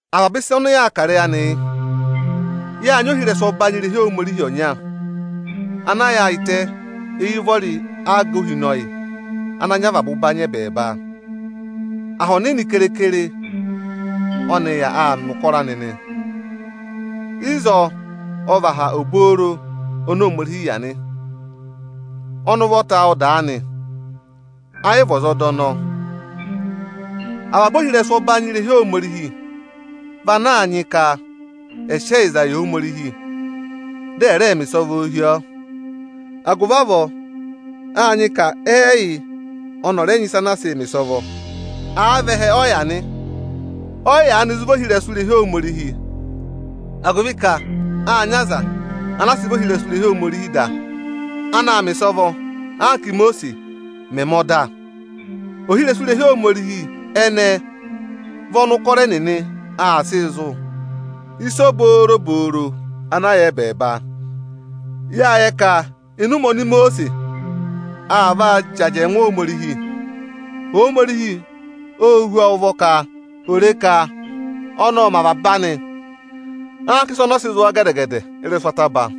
Avaba ịsa ọnị yaa kà ịrẹyị anị yị: Yáa nyị ohirẹsụ ọbanyị irehi Ohomorihi ọnya, ana yaayịtẹ éyi ụvọrị aga ohinọyị, ana nyị avaba ụbanyị ẹ́bẹẹba. Aha ọnịnị keekere ọ́nị yà aa mẹ̀ ụkọrọ anị nị. Ịzọọ ọ vị aha obooro oni Ohomorihi yà nị. Ọnị ụvọta ọ dàa nị; ayị vị ọza ọ dà ọnọọ. Avaba ohirẹsụ ọbanyị irehi Ohomorihi vị ana a nyị ka ẹẹ sị ẹyịza yị Ohomorihi dị ẹ̀ rẹẹ mẹ ịsọvọọ hi ọọ. Agụvị avọọ áa nyị ka ẹ́ẹyị ọnị ọ̀ rẹ nyị ịsa ana aa sịị mẹ̀ ịsọvọ. Àa vị ẹhẹ ọ yà nị, ọ yị yaanị zụ vị ohirẹsụ irehi Ohomorihi, agụvị ka áa nyị aza ana sị vị ohirẹsụ irehi Ohomorihi da, ana aa mẹ̀ ịsọvọ, anka Ímosiisi mẹ̀ mẹ ọda. Ohirẹsụ irehi Ohomorihi ẹnẹẹ vị ọnị ụkọrọ ẹnịnị aa sịị zụ̀ ịsa obobooro ana yà ẹbẹẹba. Yáa yẹ ka ịnị ụmẹ oni Imosiisi aa vaa jị ajẹngụ Ohomorihi, Ohomorihi óo hú ọọ ụvọ ka ò re ka ọnị ọ́ọ mẹ avaba anị anka ịsị ọnị sị zụ̀ ọọ gẹdẹ-gẹdẹ ị́rẹsụ ataba.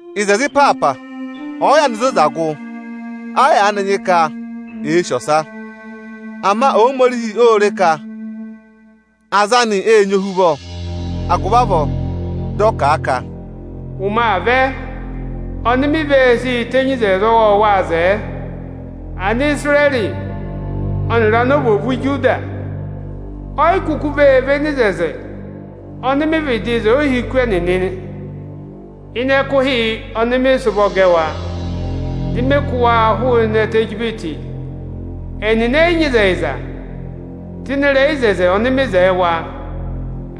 Ịzẹzẹ ịpaapa ọ̀ọ yaanị zoza gụ, ẹ yị yaanị nyị ka èe sì ọsa. Ama Ohomorihi ô re ka aza anị ệ nyị ohuvọ, agụvị avọọ dị ọ kà a ka: Ụmẹ aa vẹ, ọnị ọnị ve sii tenyi oto ọwọọwaa zẹẹ Anisirẹrị ọnịrị anovwoovu Ijuda. O yi kuku vee véné oto ọnị ọnị vịdị wo yị ohiku ẹnịnị ịnị ẹkụhị ọnị ọnị sị ụvọ gẹ wa, dị ọnị kụ́ wa hụụnị ẹtẹ Ijipiti. Ẹnịnị ẹ yị nyị ịzẹyịza tụ́ ịnị ịrẹyị oto ọnọọ ọnị ọnị wo yị wa.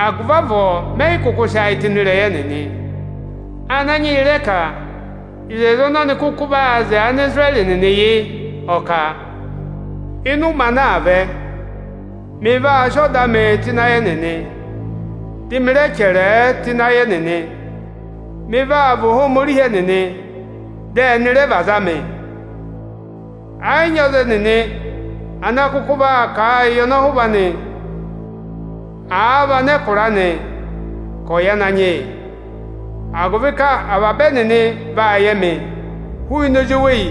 Agụvị avọọ ọnị ẹ yị kụkụ sị ayị tụ́ ịnị ịrẹyị ẹnịnị. Ananyị yị rẹ kà oto ọnị ọnị kụkụ vee wo yị Anisirẹrị nịnị yị: Ọ kà, Ịnị ụmẹ ana aa vẹ, ọnị vaa sị ọda anịị tụ́ ịnị ayị ẹnịnị, dị ọnị rẹ chẹrẹẹ tụ́ ịnị ayị ẹnịnị. Ọnị vaa vị Ohomorihi ẹnịnị, dị ẹnị rẹ vị aza anị. Ẹ yị nyị ọza ẹnịnị ana kụkụ vaa kà a yị ọnọhụva anị, à vị anẹkụra anị ka ọ̀ yẹ Ananyị yị, agụvị ka avaba ẹnịnị vaa yẹ ọnị hụụnị ozweyi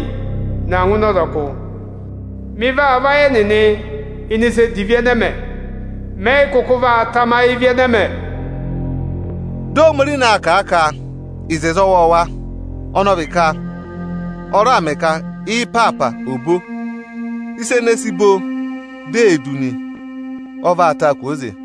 na ngụ ịnị ọzọkụ ẹnịnị. Ọnị vaa vayị ẹnịnị ịnị ịsa edivi ẹnẹ ẹ mẹ, ọnị ẹ yị kụkụ vaa tamayị ịvị ẹnẹ mẹ. Dị Ohomorihi na aa kà a ka, “oto ọwọọwa”, ọnị ọ vị ka ọ raà mẹ ka ị́ịpaapa ò bo. Ịsa ene èe si bo, di ee du nị, ọ vaa taa kwooze.